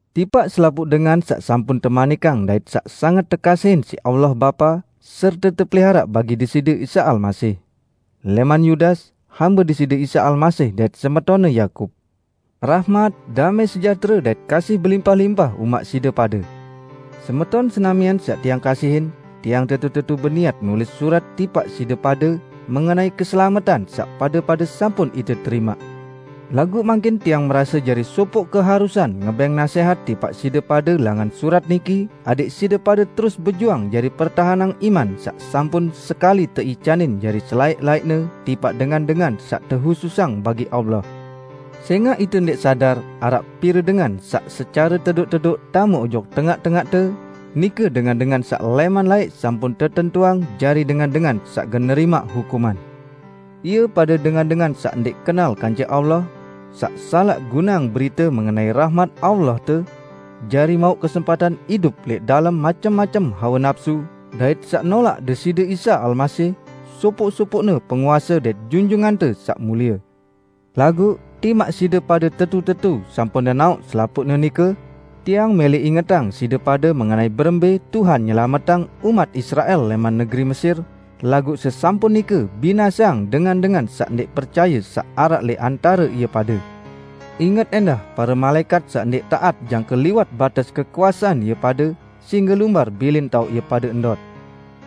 Tipaq selapuq dengan saq sampun temanikang dait saq sanget tekasihin siq Allah Bapa serte tepeliharaq bagi Deside Isa Almasih. Lẽman -- Yudas -- hambe Deside Isa Almasih dait semetonne Yakub. Rahmat, damẽ sejahtere dait kasih belimpah-limpah umaq side pade. Semeton senamian saq tiang kasihin! Tiang tetu-tetu beniat nulis surat tipaq side pade, mengenai keselametan saq pade-pade sampun ite terimaq. Laguq mangkin tiang merase jari sopoq keharusan ngebẽng nasẽhat tipaq side pade langan surat niki adẽq side pade terus bejuang jari pertahenang iman saq sampun sekali teicanin jari selaẽq-laẽqne tipaq dengan-dengan saq tehususang bagi Allah. Sẽngaq ite ndẽq sadar, araq pire dengan saq secare tedoq-tedoq tame ojok tengaq-tengaqte, nike dengan-dengan saq lẽman laẽq sampun tetentuang jari dengan-dengan saq gen nerimaq hukuman. Ie pade dengan-dengan saq ndẽq kenal kance Allah saq salaq guneang berite mengenai rahmat Allahte, jari mauq kesempatan idup lẽq dalem macem-macem hawe napsu, dait saq nolaq Deside Isa Almasih, sopoq-sopoqne Penguase dait Junjungante Saq Mulie. Laguq, timaq side pade tetu-tetu sampun nenaoq selapuqne nike, tiang mẽlẽ ingetang side pade mengenai berembẽ Tuhan nyelametang umat Israel lẽman negeri Mesir, laguq sesampun nike binaseang dengan-dengan saq ndẽq percaye saq araq lẽq antare ie pade. Inget ẽndah pare malaẽkat saq ndẽq taat jangke liwat bates kekuasean ie pade, sehingge lumbar bilin taoq ie pade ndot.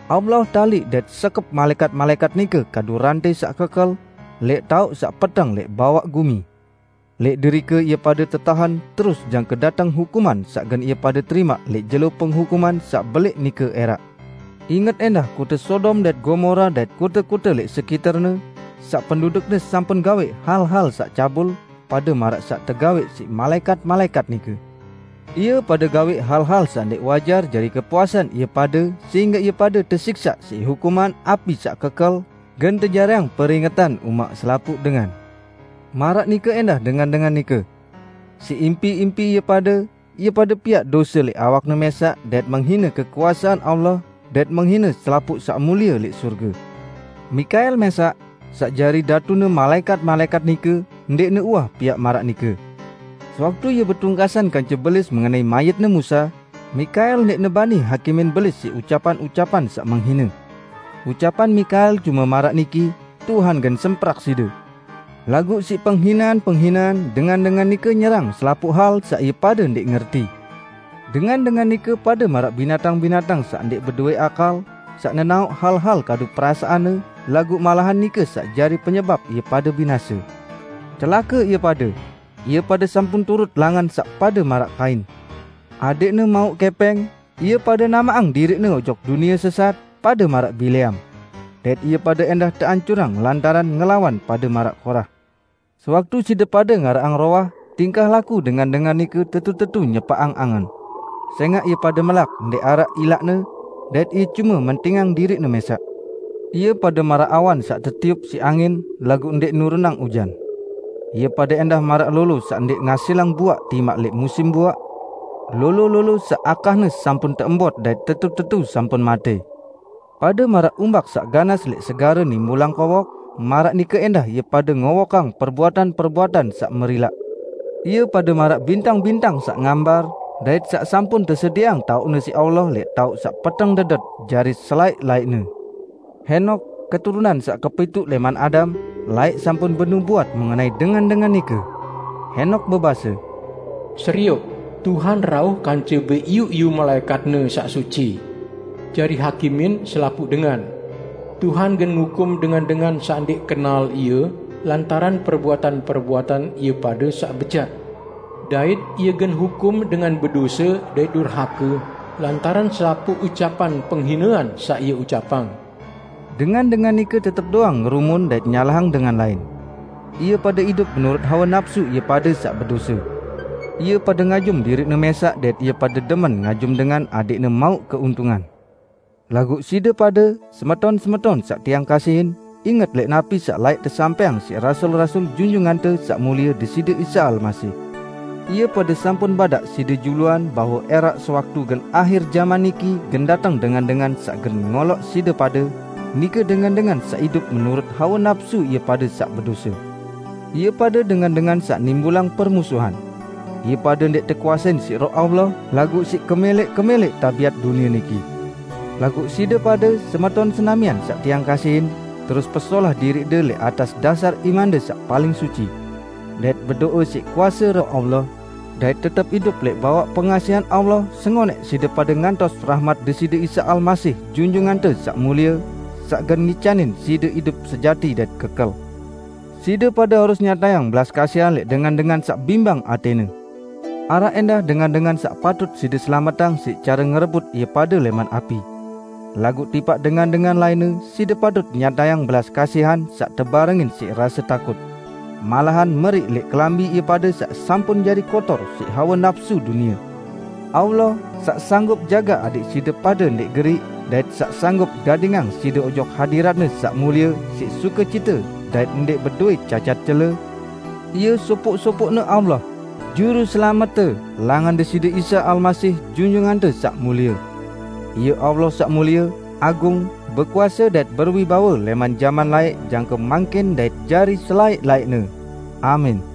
Allah taliq dait sekep malaẽkat-malaẽkat nike kadu rantẽ saq kekel, lẽq taoq saq peteng lẽq bawaq gumi. Lẽq derike ie pade tetahen terus jangke dateng hukuman saq gen ie pade terimaq lẽq jelo penghukuman saq belẽq nike ẽraq. Inget ẽndah kote Sodom dait Gomora dait kote-kote lẽq sekiterne, saq pendudukne sampun gawẽq hal-hal saq cabul pade maraq saq tegawẽq siq malaẽkat-malaẽkat nike. Ie pade gawẽq hal-hal saq ndẽq wajar jari kepuasan ie pade sehingge ie pade tesiksaq siq hukuman api saq kekel, gen tejariang peringetan umaq selapuq dengan. Maraq nike ẽndah dengan-dengan nike. Siq impi-impi ie pade, ie pade piaq dose lẽq awakne mẽsaq dait menghine kekuasean Allah, dait menghine selapuq saq mulie lẽq sorge. Mikael mẽsaq, saq jari datune malaẽkat-malaẽkat nike, ndẽqne uwah piaq maraq nike. Sewaktu ie betungkasan kance Belis mengenai mayitne Musa, Mikael ndẽqne bani hakimin Belis siq ucapan-ucapan saq menghine. Ucapan Mikael cume maraq niki, "Tuhan gen semprak side!" Laguq siq penghinean-penghinean, dengan-dengan nike nyerang selapuq hal saq ie pade ndẽq ngerti. Dengan-dengan nike pade maraq binatang-binatang saq ndẽq bedowẽ akal, saq nenaoq hal-hal kadu perasaanne, laguq malahan nike saq jari penyebap ie pade binase. Celake ie pade! Ie pade sampun turut langan saq pade maraq Kain. Adẽqne mauq kẽpẽng, ie pade namaqang diriqne ojok dunie sesat, pade maraq Bileam. Dait ie pade ẽndah teancurang lantaran ngelawan pade maraq Korah. Sewaktu side pade ngaraqang rowah, tingkah laku dengan-dengan nike tetu-tetu nyepaqang angen. Sẽngaq ie pade melak ndẽq araq ilaqne, dait ie cume mentingang diriqne mẽsaq. Ie pade maraq awan saq tetiup siq angin, laguq ndẽq nurunang ujan. Ie pade ẽndah maraq lolo saq ndẽq ngasilang buaq timaq lẽq musim buaq; lolo-lolo saq akahne sampun teembot dait tetu-tetu sampun matẽ. Pade maraq umbak saq ganas lẽq segare nimbulang kowok, maraq nike ẽndah ie pade ngowokang perbuatan-perbuatan saq merilaq. Ie pade maraq bintang-bintang saq ngambar, dait saq sampun tesedieang taoqne siq Allah lẽq taoq saq peteng dedet jari selaẽq-laẽqne. Henok, keturunan saq kepituq lẽman Adam, laẽq sampun benubuat mengenai dengan-dengan nike. Henok bebase, "Serioq, Tuhan rauh kance beiyu-iyu malaẽkat-Ne saq suci jari hakimin selapuq dengan. Tuhan gen ngukum dengan-dengan saq ndẽq kenal Ie lantaran perbuatan-perbuatan ie pade saq bejat. Dait Ie gen hukum dengan bedose dait durhake lantaran selapuq ucapan penghinean saq ie ucapang." Dengan-dengan nike tetep doang ngerumun dait nyalahang dengan lain. Ie pade idup menurut hawe napsu ie pade saq bedose. Ie pade ngajum diriqne mẽsaq dait ie pade demen ngajum dengan adẽqne mauq keuntungan. Laguq side pade, semeton-semeton saq tiang kasihin, inget lẽq napi saq laẽq tesampẽang siq rasul-rasul Junjungante Saq Mulie Deside Isa Almasih. Ie pade sampun badaq side juluan bahwe ẽraq sewaktu gen ahir jaman niki gen dateng dengan-dengan saq gen ngoloq side pade, nike dengan-dengan saq idup menurut hawe napsu ie pade saq bedose. Ie pade dengan-dengan saq nimbulang permusuhan. Ie pade ndẽq tekuasein siq Roh Suci, laguq siq kemẽlẽq-kemẽlẽq tabiat dunie niki. Laguq side pade, semeton senamian saq tiang kasihin, terus pesolah diriqde lẽq atas dasar imande saq paling suci. Dait bedo'e siq kuase Roh Suci, dait tetep idup lẽq bawaq pengasihan Allah sengonẽq side pade ngantos rahmat Deside Isa Almasih Junjungante Saq Mulie, saq gen ngicanin side idup sejati dait kekel. Side pade harus nyatayang belas kasihan lẽq dengan-dengan saq bimbang atẽne. Araq ẽndah dengan-dengan saq patut side selametang siq care ngerebut ie pade lẽman api. Laguq tipaq dengan-dengan lainne, side patut nyatayang belas kasihan saq tebarengin siq rase takut. Malahan meriq lẽq kelambi ie pade saq sampun jari kotor siq hawe napsu dunie. Allah, saq sanggup jagaq adẽq side pade ndẽq geriq, dait saq sanggup gadingang side ojok hadirat-Ne saq Mulie siq sukecite dait ndẽq bedowẽ cacat cele, Ie sopoq-sopoqne Allah, Juruselamette langan Deside Isa Almasih Junjungante Saq Mulie. Ie Allah saq mulie, agung, bekuase dait berwibawe lẽman jaman laẽq jangke mangkin dait jari selaẽq-laẽqne! Amin.